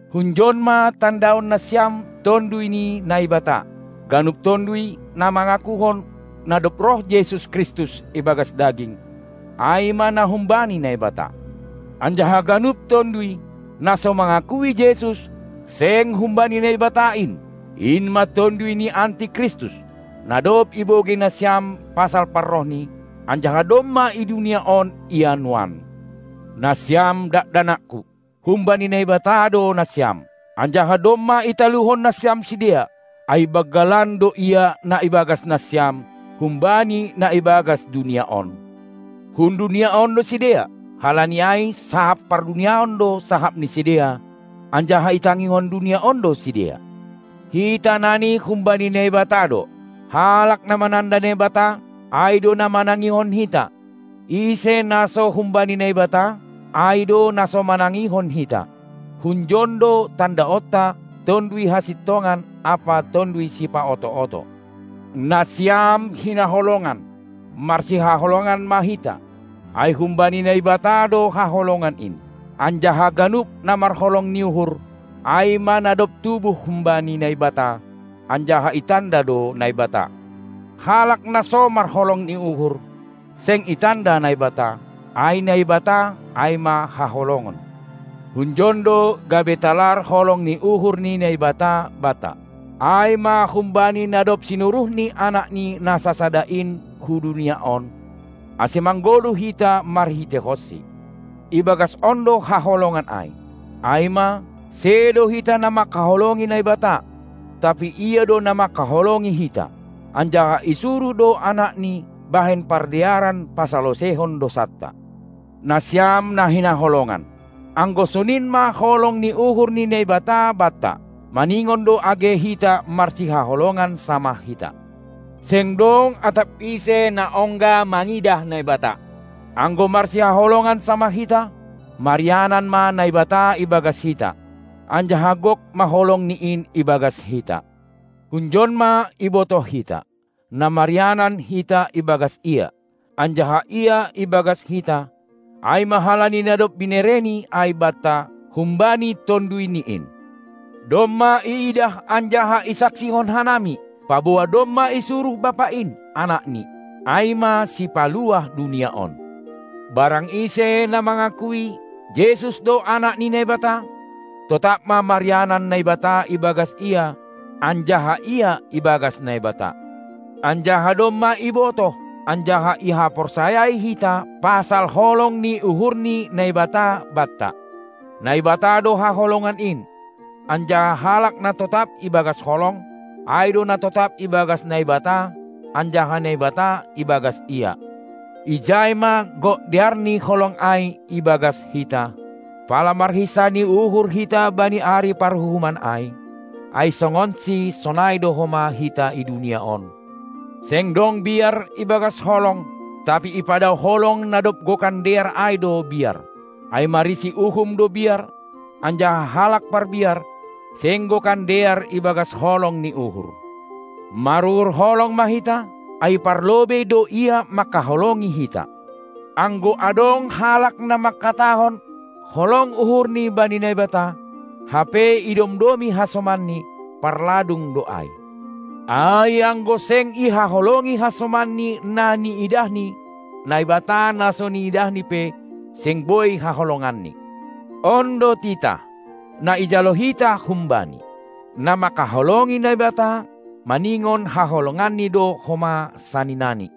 Hunjon ma tandaon nasiam Tonduy ni Naibata: Ganup tonduy, na mangakuhon, na dob roh Jesus Kristus ibagas daging, ai ma na humbani Naibata. Anjaha ganup tonduy, na so mangakui Jesus, seng humbani Naibata in. In ma tonduy ni Anti Kristus, na dob ibogei nasiam pasal parrohni, anjaha domma i dunia on Ia nuan. Nasiam dakdanakku, humbani Naibata do nasiam, anjaha domma italuhon nasiam sidea, ai banggalan do Ia na ibagas nasiam, humbani na ibagas dunia on. Hun dunia on do sidea, halani ai sahap parduniaon do sahap ni sidea, anjaha itangihon dunia on do sidea. Hita nani humbani Naibata do. Halak na mananda Naibata, ai do na manangihon hita, ise na so humbani Naibata, ai do na so manangihon hita. Hunjon do tandaonta Tonduy Hasintongan ampa tonduy sipaoto-oto. Nasiam hinaholongan, marsihaholongan ma hita, ai humbani Naibata do haholongan in, anjaha ganup na marholong ni uhur, ai ma na dob tubuh humbani Naibata anjaha itanda do Naibata. Halak na so marholong ni uhur, seng itanda Naibata; ai Naibata ai ma haholongon. Hunjon do gabe talar holong ni uhur ni Naibata banta, ai ma humbani na dob sinuruhni AnakNi na sasada in hu dunia on, ase manggoluh hita marhiteihonSi. Ibagas on do haholongan ai, ai ma, sedo hita na manghaholongi Naibata, tapi Ia do na mangkaholongi hita, anjaha isuruh do Anakni bahen pardearan pasaloseihon dousanta. Nasiam na hinaholongan, anggo sonin ma holong ni uhur ni Naibata banta, maningon do age hita marsihaholongan samah hita. Seng dong atap ise na ongga mangidah Naibata. Anggo marsihaholongan samah hita, marianan ma Naibata ibagas hita, anjaha gok ma holongNi in ibagas hita. Hunjon ma ibotoh hita, na marianan hita ibagas Ia, anjaha Ia ibagas hita, ai ma halani na dob binereNi ai banta humbani TonduyNi in. Domma iidah anjaha isaksihon hanami, paboa domma isuruh Bapa in Anakni, ai ma Sipaluah dunia on. Barang ise na mangakui, Jesus do Anak ni Naibata, totap ma marianan Naibata ibagas ia anjaha ia ibagas Naibata. Anjaha domma ibotoh anjaha ihaporsayai hita pasal holong ni uhur ni Naibata banta. Naibata do haholongan in, anjaha halak na totap ibagas holong, ai do na totap ibagas Naibata, anjaha Naibata ibagas ia. Ijai ma gok dear ni holong ai ibagas hita, pala marhinsah ni uhur hita bani ari paruhuman ai; ai songonSi sonai do homa hita i dunia on. Seng dong biar ibagas holong, tapi ipadaoh holong na dob gokan dear ai do biar, ai marisi uhum do biar, anjaha halak parbiar, seng gokan dear ibagas holong ni uhur. Maruhur holong ma hita, ai parlobei do Ia manghaholongi hita. Anggo adong halak na mangkatahon holong uhurni bani Naibata, hape idomdomi hasomanni, parladung do ai. Ai anggo seng ihaholongi hasomanni na niidahni, Naibata na so niidahni pe, seng boi haholonganni. On do titah, na ijalo hita hum-Bani: Na manghaholongi Naibata, maningon haholonganni do homa saninani.